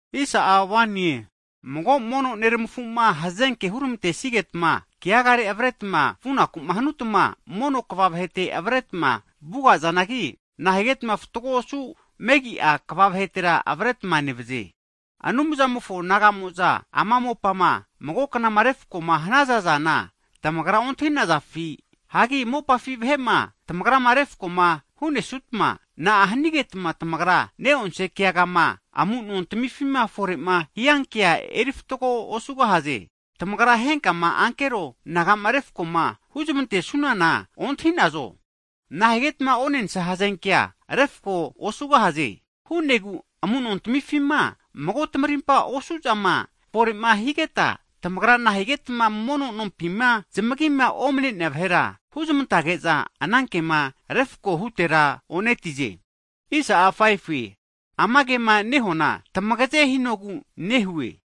Hagi mago mono neramafu'ma hazenke huramantesigetma keagare avretma vunaku'ma hanutma, mono kva vahete avaretma vuga'zanagi, nahigetma fatgo osu megi'a kva vahetera avretma nevaze? Anumzamofo naga'mo'za ama mopafi vahe'ma mago knazupama refko'ma hanaza zana, tamagra ontahi'nazafi? Hagi mopafi vahera tamagra refko huzmantegahazanki, na'a hanigetma tamagra neonse keagama amunontmifima fore'ma hiankea erifatgo nosaze? Tagrama henkama ankero naga'ma refko'ma huzmante'sunana ontahi'nazo? Nahigetma onensa hazenkea refko osugahaze! Hu'negu amu'nontamifima mago tamarimpa osu'zama fore'ma higeta, tamagra nahigetma mono nompima zamagima omne'nea vahera huzmantage'za, ana kema refko hutera o'netize? Ama kema nehuana tamagaze hinogu nehue!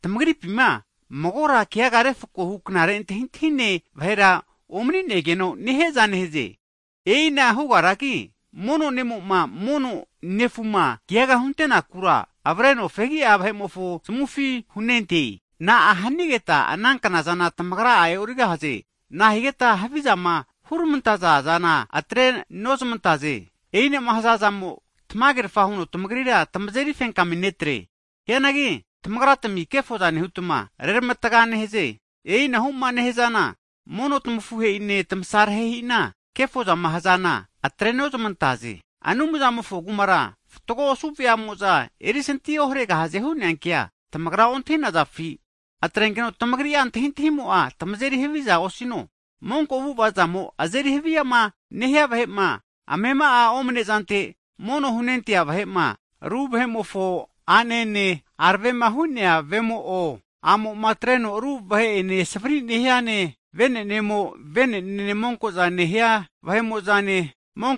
Tamagripina magora keaga refkohu knare antahintahine vahera omani'negeno'ma nehiaza nehaze. E'ina hugaragi, mono ne'mo'ma, mono nefuma keaga huntenakura, avreno fegia vahe'mofo zamufi hunente. Na'a hanigeta ana knazana tamagra'a e'origahaze? Na'a higeta havizama hurmantazana atrenozmantaze? E'inama hazazamo'a tamagerafa huno tamagrira tamazeri fenkami netre. Hianagi tamagratmi kefozana nehutma, reramatga nehaze. E'inahu'ma nehazana, mono tmafuhe'ine tamasarehe'ina kefozama hazana atrenozmantaze. Anumzamofo Kumara fatgo osu veamo'za erisanti oharegahaze hu'nea kea tamagra ontahi'nazafi? Atrenkeno tamagri'a antahintahimo'a tamazeri havia osino! Monko avu'ava'zamo azeri haviama nehia vahe'ma, amema'a omne zante mono'ma hunentea vahe'ma ru vemofo a'nene, aravema hu'nea vemo'o, a'mo'ma atreno ru vene savri nehiane, vene'nemo vene'nene monko'za nehia vahe'mo'zane,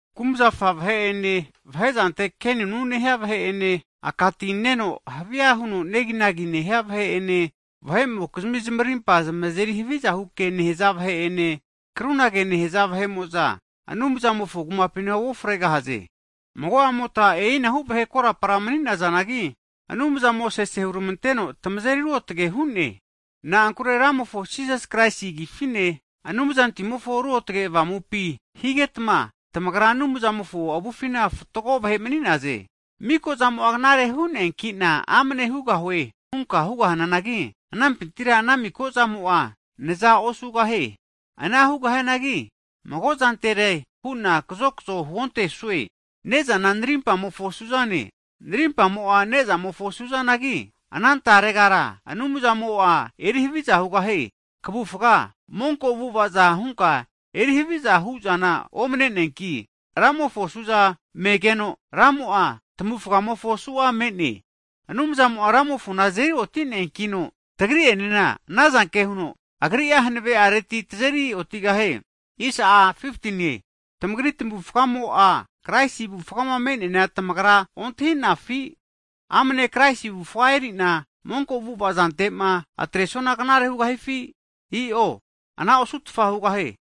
kumzafa vahe'ene, vahe zante kenunu nehia vahe'ene, aka ti neno havia huno neginagi nehia vahe'ene, vahe'mokizmi zamarimpa zamazeri havizahu ke nehaza vahe'ene, krunage nehaza vahe'mo'za, Anumzamofo Kumapina uofregahaze. Mago'amota e'inahu vahe korapara mani'nazanagi, Anumzamo sese hurmanteno, tamazeri ruotge hu'ne. Na'ankure Ramofo Jisas Kraisi Agifine, Anumzantimofo Ruotage Avamupi higetma, tamagra Anumzamofo avufina fatgo vahe mani'naze. Miko'zana knare hu'neanki'na amne hugahue hunka hugahananagi, anampintira ana miko'zamo'a kaza osugahie. Ana hugahianagi, mago'zantere hu'na kazokzo huontesue. Ne'zana narimpamofo suzane, narimpamo'a nezamofo suzanagi, ana taregara Anumzamo'a zanazeri haviza hugahie. Kavufga monko avu'ava'za hunka eri haviza hu'zana omne'neanki, Ramofo suza menegeno Ramo'a, tvufgamofo su'ane. Hagi Anumzamo'a Ramofona fripintira azeri oti'neankino, tagri'enena ana zanke huno, Agri'a hanavereti tazeri otigahie. Tamagri tamavufgamo'a, Kraisi avufgama me'neana tamagra ontahi'nafi? Amane Kraisi avufa eri'na monko avu'ava zante'ma atresuana knare hugahifi? I'o anara osutfa hugahie!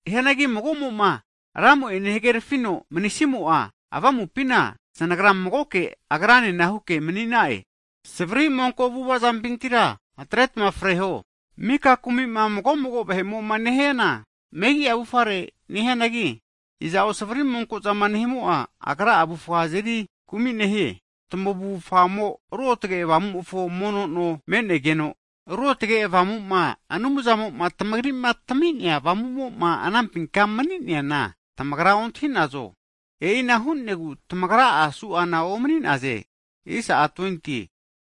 Hianagi mago'moma Ramo'ene hagerafino manisimo'a, avamupina zanagra magoke Agranena huke manigaha'e. Savari monko avu'ava zampintira atretma freho! Mika kumi'ma mago'mago vahe'mo'ma nehiana, megi'a avufare nehianagi, iza'o savari monko'za nehimo'a, agra'a avufga azeri kumi nehie. Tamavufamo'a Ruotage Avamumofo mono no me'negeno, Ruotge Avamuma Anumzamo'ma tamagri'ma tami'nea avamumo'ma anampinkama mani'neana tamagra ontahi'nazo? E'ina hu'negu tamagra'a su'ana omani'naze.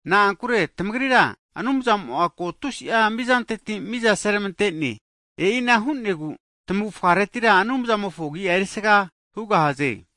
Na'ankure tamagrira Anumzamo'a ko tusi'a mizanteti miza seramante'ne. E'ina hu'negu tamavufgareti Anumzamofo Agi'a erisaga hugahaze.